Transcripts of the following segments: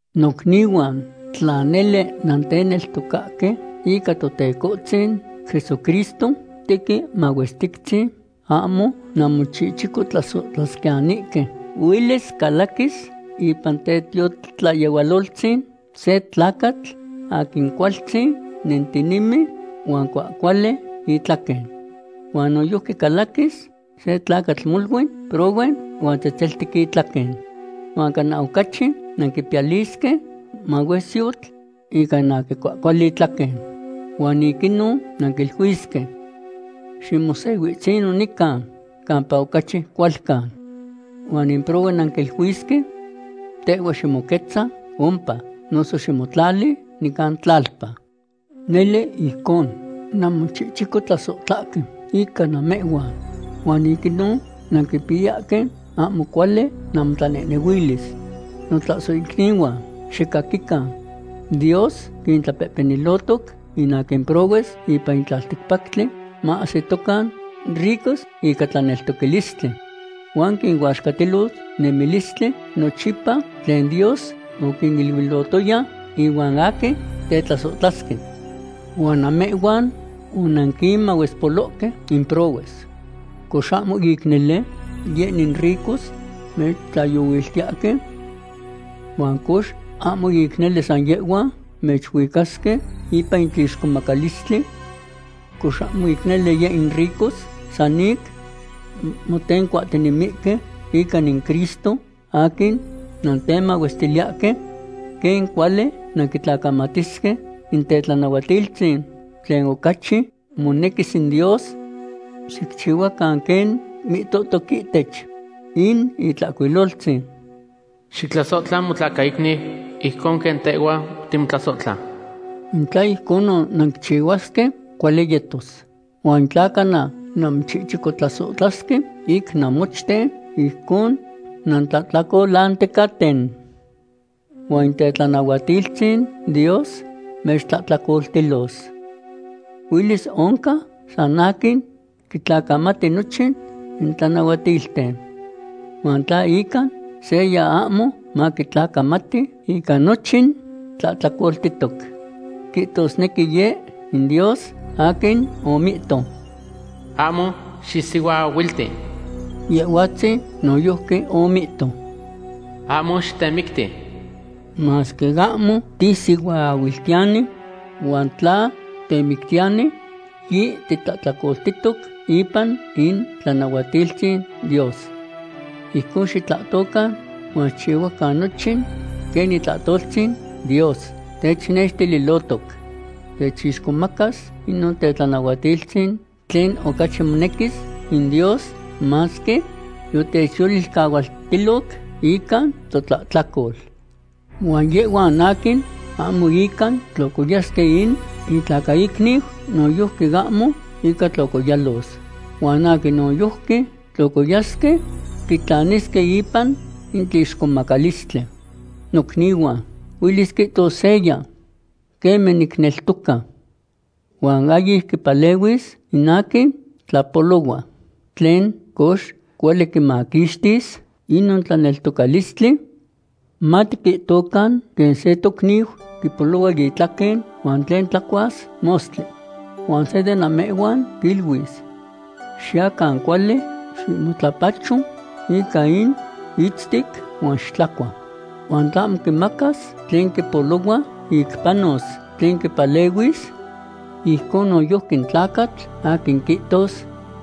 Nocnihuan, tla nele nanteneltocahque ica Totecohtzin Jesucristo tequin mahuestictzin, ahmo nanmochichicotlasohtlasquiyanihque. Huelis calaquis ipan tetiotlayehualoltzin se tlacatl aquin cualtzin nentinemi huan cuahcuali itlaquen. Huan noyojqui calaquis se tlacatl molui prohue huan tzetzeltic itlaquen. Huan cana ocachi nanquipiyalisque mahuesyotl ica in aquin cuahcuali itlaquen. Huan ic inon nanquiluisque: “Ximosehuitzino nican campa ocachi cualcan.” Huan in prohue nanquiluisque: “Tehhua ximoquetza ompa, noso ximotlali nican tlalpa.” Nele ijcon nanmochichicotlasohtlahque ica namehhuan. Huan ic inon nanquipiyahque ahmo cuali namotlanehnehuilis. Notlasohicnihuan, xicaquican. Dios quintlapehpenilohtoc in aquin prohues ipan in tlalticpactli maahsitocan ricos ica tlaneltocalistli. Huan quinuaxcatilos in nemilistli nochipa tlen Dios oquiniluilohtoya ihuan aquin tetlasohtlasque. Huan namehhuan onanquinmahuespolohque in prohues. ¿Cox ahmo ic nele yeh in ricos mechtlahyohuiltiyahque? ¿Huan cox ahmo ic nele san yehhuan mechuicasque ipan in tlixcomacalistli? ¿Cox ahmo ic nele yeh in ricos san ic motencuahtinemihque ica in Cristo aquin nantemahuestiliyahque? ¿Quen cuali nanquitlacamatisque in tetlanahuatiltzin tlen ocachi monequis in Dios? Xicchihuacan quen mihtohtoc ihtech in Itlahcuiloltzin: “Xictlasohtla motlacaicniu ijconon quen tehhua timotlasohtla.” In tla ijconon nanquichihuasque, cuali yetos. Huan in tla cana nanmochichicotlasohtlasque ic namochten, ijcon nantlahtlacolanticaten. Huan in tetlanahuatiltzin Dios mechtlahtlacoltis. Huelis oncan san aquin quitlacamati nochin in tlanahuatilten. Huan in tla ica seya ahmo maquitlacamati, ica nochin tlahtlacoltihtoc. Quihtosnequi Yeh in Dios aquin omihto: “Ahmo xisihuaahuilti”, Yehhuatzin noyojqui omihto: “Ahmo xitemicti.” Masque ahmo tisihuaahuiltiyani, huan tla titemictiyani, yititlahtlacoltihtoc ipan itlanahuatiltzin Dios. Ijcon xitlahtocan huan xicchihuacan nochin quen itlahtoltzin Dios technextililohtoc. Techixcomacas inon tetlanahuatiltzin tlen ocachi monequis in Dios, masque yotechyolilcahualtiloc ica totlahtlacol. Huan yehhuan aquin ahmo ica tlocoyasque in intlacaicniu, noyojqui ahmo inca tlocoyalos. Huan aquin noyojqui tlocoyasque quitlanisque ipan in tlixcomacalistli. Nocnihuan, huelis quihtos seya: “Queme niteneltoca.” Huan ahyic quipalehuis in aquin tlapolohua. ¿Tlen, cox, cuali quimaquixtis inon tlaneltocalistli? Matiquihtocan quen se tocniu quipolohua itlaquen huan tlen tlacuas mostli. Huan se de namehhuan quiluis: “Xiyacan cuali; ximotlapacho ica in itztic, huan xitlacua.” ¿Huan tlahmo quimacas tlen quipolohua ic panos, tlen quipalehuis? Ijcon noyojqui in tlacatl aquin quihtos: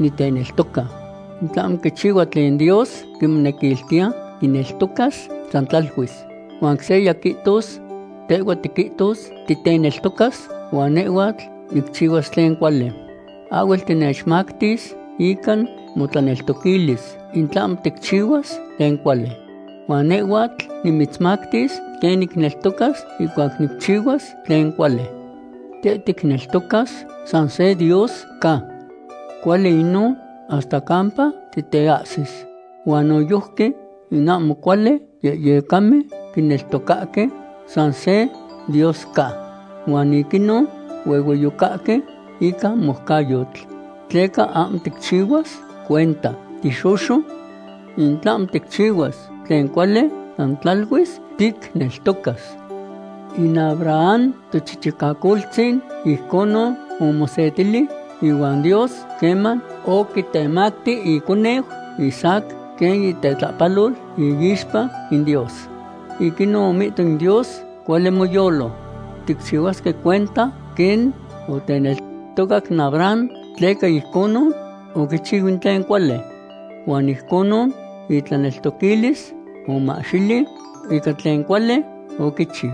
“Niteneltoca.” In tlahmo quichihua tlen Dios quimonequiltiya, quineltocas san tlaluis. Huan seya quihtos: “Tehhuatl tiquihtos titeneltocas huan nehhuatl nicchihuas tlen cuali.” Ahhuel tinechmactis ica motlaneltoquilis in tlahmo ticchihuas tlen cuali. Huan nehhuatl nimitzmactis quen nicneltocas ihcuac nicchihuas tlen cuali. Teh ticneltocas san se Dios ca. Cuali inon hasta campa titeahsis. Huan noyojqui in ahmo cuali yehyecamen quineltocahque san se Dios ca. Huan ic inon huehueyocahque ica moucayotl. ¿Tleca ahmo ticchihuas cuenta, tixoxo? In tlahmo ticchihuas tlen cuali san tlaluis ticneltocas. In Abraham tochichicacoltzin ijconon omosetili ihuan Dios queman oquitemacti iconeu Isaac quen itetlapalol iixpa in Dios. Ic inon omihto in Dios: “Cuali moyolo.” Ticchihuasque cuenta quen oteneltocac in Abraham tleca ijconon oquichiu in tlen cuali. Huan ijconon itlaneltoquilis omahxili ica tlen cuali oquichiu.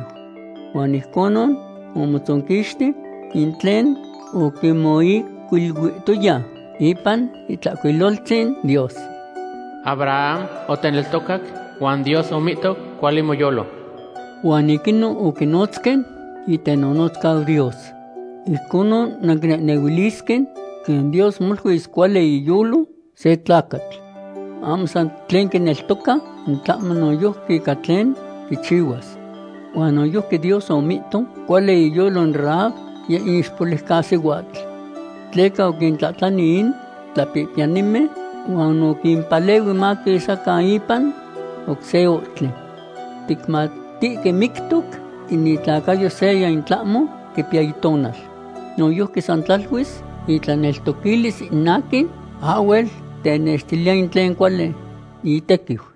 Huan ijconon omotzonquixti in tlen oquimoihcuiluihtoya ipan Itlahcuiloltzin Dios: “Abraham oteneltocac huan Dios omihto: Cuali moyolo.” Huan ic inon oquinotzque itenotzcau Dios. Ijconon nanquinehnehuilisque quen Dios moluis cuali iyolo se tlacatl. Ahmo san ic tlen quineltoca, in tlahmo noyojqui ica tlen quichihuas. Huan noyojqui Dios omihto cuali iyolo in Rahab, yeh in ixpoliucasihuatl. Tleca oquintlati in tlapihpiyanimen, huan oquimpalehui maquisacan ipan oc se ohtli. Ticmatihque mictoc in itlacayo seya in tlahmo quipiya itonal. Noyojqui san tlaluis itlaneltoquilis in aquin ahhuel tenextiliya in tlen cuali itequiu.